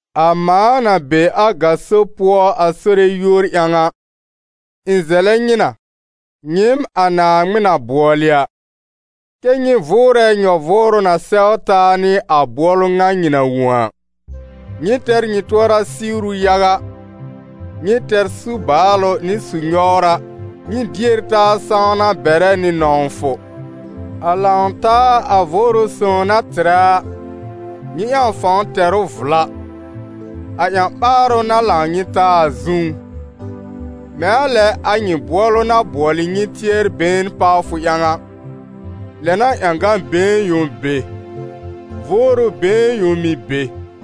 A mãa na be a gaso pʋɔ a Sore yúor ƴãw a, ɩ̃ zɛlɛ nyɩ na, nyɩɩm a Naaŋmɩn na bʋɔlɩ a, kɛ́ nyɩ vʋʋrɛ nyɔ-vʋʋrʋ na sɛw taa nɩ a bʋɔlʋ ŋa nyɩ na wõ a. Nyɩ tɛr nyɩ tʋɔra siwru yaga, nyɩ tɛr su-baalʋ nɩ su-nyɔwra, nyɩ dier taa sãwna bɛrɛ nɩ nɔ̃wfʋ. A lãw-taa a Vʋʋrʋ Sõw na tɩrɛ a, nyɩ ƴãw fãw tɛr ʋ vla, a ƴã-ɓaarʋ na lãw nyɩ taa a zũú. Mɛ̃ a lɛ a nyɩ bʋɔlʋ na bʋɔlɩ nyɩ tɩɛr-been pawfʋ ƴãw a, lɛ n'a ƴãgã-been yõ be, Vʋʋrʋ been yõ mɩ̀ be.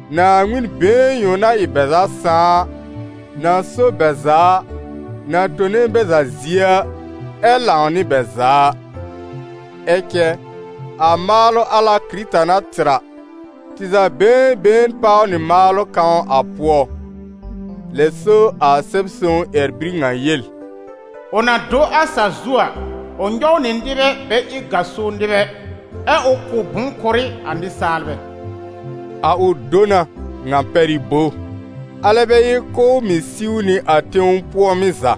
Naaŋmɩn been yõ na ɩ a bɛ za Sãà a, na so bɛ za a, na tone bɛ za zie a, ɛ lãw nɩ bɛ za a. Ɛ cɛ a maalʋ al a Kɩrɩta na tɩr a, tɩ za been been páw nɩ maalʋ kãw a pʋɔ. Lɛ so a Sɛb-sõw ƴɛr-bir ŋa yel: «Ʋ na do a sa-zu a, ʋ nyɔw nɩ nɩbɛ bɛ ɩ gaso nɩbɛ, ɛ ʋ kʋ̀ bʋ̃-kʋrɩ a nɩsaalbɛ.» A «ʋ do na» ŋa pɛr ɩ bo? Alɛ bɛ ɩ k'ʋʋ mɩ̀ siw nɩ a tẽw pʋɔ̃mɩ́ za?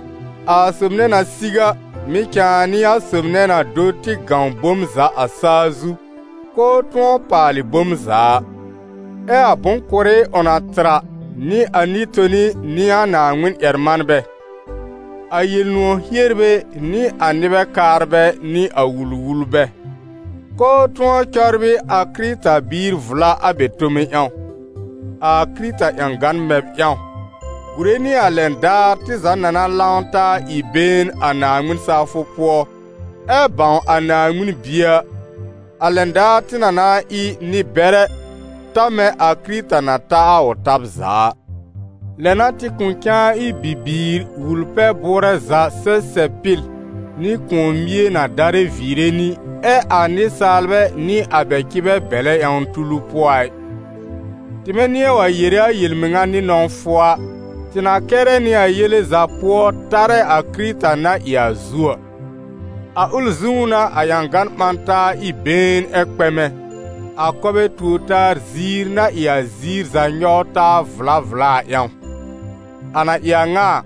A sob nɛ na siw a, mɩ̀ cãa n'ɩ a sob nɛ na do tɩ gãw bom za a sa-zu, k'ʋʋ tʋ̃ɔ paalɩ bom za a. Ɛ a bʋ̃-kʋrɩ ʋ na tɩr a n'ɩ a nɩ-toni nɩ a Naaŋmɩn-ƴɛr-manbɛ, a Yel-nʋ̃ɔ̀ hierbɛ nɩ a nɩbɛ kaarbɛ nɩ a wul-wulbɛ, k'ʋʋ tʋ̃ɔ cɔbrɩ a Kɩrɩta-biir vla a bɛ tome ƴãw: a Kɩrɩta ƴãgan mɛb ƴãw, gùre nɩ a lɛn daar tɩ za na na lãw taa ɩ been a Naaŋmɩn-sawfʋ pʋɔ ɛ bãw a Naaŋmɩn Bie a, a lɛn daar tɩ na na ɩ nɩ-bɛrɛ, ta mɛ̃ a Kɩrɩta na ta a ʋ tab za a. Lɛ n'a tɩ kʋ̃ cãa ɩ bibiir wul-pɛ-bʋʋrɛ za sɛsɛb-pɩl nɩ kʋ̃ɔ-mie na darɛ viire nɩ, ɛ a nɩsaalbɛ nɩ a bɛ cɩbɛ bɛlɛ ƴãwn tulu pʋɔ a ɩ. Tɩmɛ nɩ̃ɛ wa yere a yel-mɩŋa nɩ nɔ̃wfʋ a, tɩ na kɛrɛ nɩ a yele za pʋɔ tarɛ a Kɩrɩta na ɩ a zu a. A ʋl zũú n'a a ƴãgan ɓã taa ɩ been ɛ kpɛmɛ, a kɔbɛ tuor-taa ziir na ɩ a ziir za nyɔw taa vla vla a ƴãw. A na ɩ a ŋa a,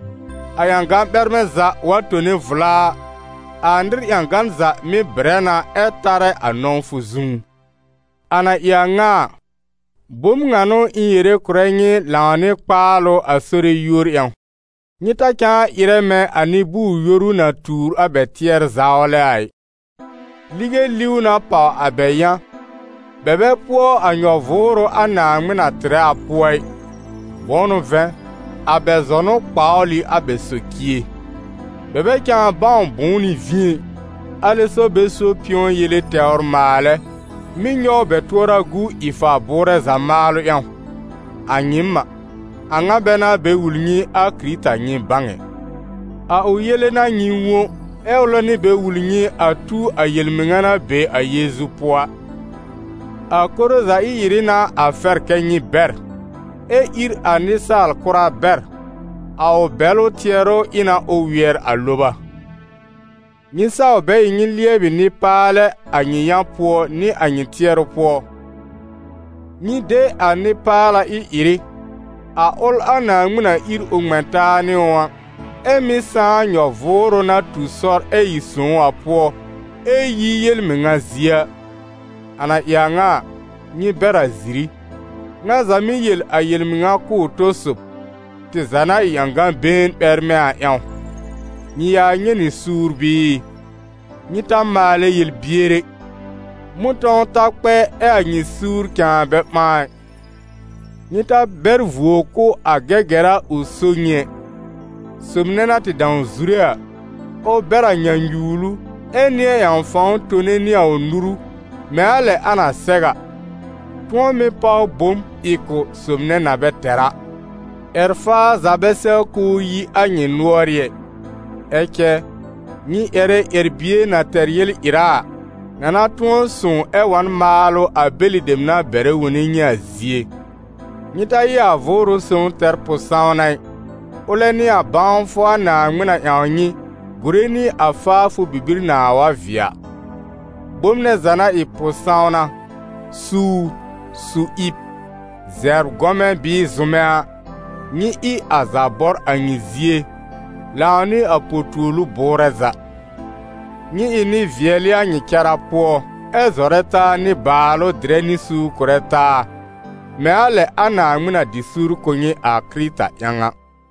a ƴãgan ɓɛrmɛ̃ za wa tone vla a, a nɩr ƴãgan za mɩ́ bɩrɛ na ɛ tarɛ a nɔ̃wfʋ zũú. A na ɩ a ŋa a, bom ŋa n'ʋ ɩ̃ yere kʋ̀rɛ nyɩ lãw nɩ kpaalʋ a Sore yúor ƴãw: nyɩ ta cãa ɩrɛ mɛ̃ a nɩ-bʋʋr-yoru na tuur a bɛ tɩɛr-zawlɛ a ɩ. Lige liw na pàw a bɛ yã, bɛ bɛ pʋɔ a nyɔ-vʋʋrʋ a Naaŋmɩn na tɩrɛ a pʋɔ ɩ, bʋ̃ʋ n'ʋ vɛ̃, a bɛ zɔnʋ kpawl ɩ a bɛ socie. Bɛ bɛ cãa bãw bʋ̃ʋ n'ɩ vĩ ɛ, alɛ so bɛ so pɩ̃ɔ yele tɛwr maalɛ, mɩ́ nyɔw bɛ tʋɔra gu ɩ-fa-bʋʋrɛ za maalʋ ƴãw. A nyɩɩm a, a ŋa bɛ n'a bɛ wul nyɩ a Kɩrɩta nyɩ bãw ɛ. A ʋ yele n'a nyɩ wõ, ɛ ʋlɛ n'ʋ bɛ wul nyɩ a tu a yel-mɩŋa na be a Yeezu pʋɔ a. A koro za ɩ-ɩrɩ n'a a fɛr kɛ́ nyɩ bɛr, ɛ ír a nɩsaal kʋra bɛr, a ʋ bɛlʋ tɩɛrʋ ɩ na ʋ wɩɛr a loba. Nyɩ saw bɛ ɩ nyɩ lɩɛbɩ nɩ-paalɛ a nyɩ yã pʋɔ nɩ a nyɩ tɩɛrʋ pʋɔ; nyɩ de a nɩ-paala ɩ-ɩrɩ, a ʋl a Naaŋmɩn na ír ʋ ŋmɛ̃ taa nɩ ʋ, ɛ mɩ́ sãá nyɔ-vʋʋrʋ na tu sɔr ɛ ɩ sõw a pʋɔ, ɛ yi yel-mɩŋa zie a. A na ɩ a ŋa a, nyɩ bɛr a ziri: ŋa za mɩ́ yel a yel-mɩŋa kʋ̀ ʋ tɔ-sob, tɩ za na ɩ ƴãgã-been ɓɛrmɛ̃ a ƴãw. Nyɩ ya nyɛ̃ nɩ suur bɩɩ? Nyɩ taa maalɛ yel-bier ɛ; mʋ̃tɔ̃w ta kpɛ ɛ a nyɩ suur cãa bɛ ɓãa ɩ. Nyɩ ta bɛr vuo kʋ̀ a Gɛgɛra ʋ so nyɩ ɛ. Sob nɛ na tɩ dãw zure a, ʋ bɛr a nyãnyuwlu ɛ nɩ̃ɛ ƴãw fãw tone nɩ a ʋ nuru, mɛ̃ a lɛ a na sɛw a, tʋ̃ɔ mɩ́ páw bom ɩ kʋ̀ sob nɛ na bɛ tɛr a. Ƴɛr-faa za bɛ sɛw k'ʋʋ yi a nyɩ nʋɔrɩ́ ɛ, ɛ cɛ nyɩ ƴɛrɛ ƴɛr-bie na tɛr yel-ɩra a, na na tʋ̃ɔ sõw ɛ wa n maalʋ a bɛlɩ dem na bɛrɛ wone nyɩ a zie. Nyɩ ta ɩ a Vʋʋrʋ Sõw tɛr pʋ-sãwna ɩ, ʋlɛ n'ɩ a bãwfʋ a Naaŋmɩn na ƴãw nyɩ, gùre nɩ a faafʋ bibir nãa wa vɩɛ a. Bom nɛ za na ɩ pʋ-sãwna, suur, su-ɩb, zɛbr-gɔmɛ̃ bɩɩ zʋmɛ a, nyɩ ɩ a za bɔr a nyɩ zie, lãw nɩ a po-tuolu bʋʋrɛ za. Nyɩ ɩ nɩ-vɩɛlɩ a nyɩ cara pʋɔ, ɛ zɔrɛ taa nɩ-baalʋ dɩrɛ nɩ suur kʋ̀rɛ taa, mɛ̃ a lɛ a Naaŋmɩn na dɩ suur kʋ̀ nyɩ a Kɩrɩta ƴãw a.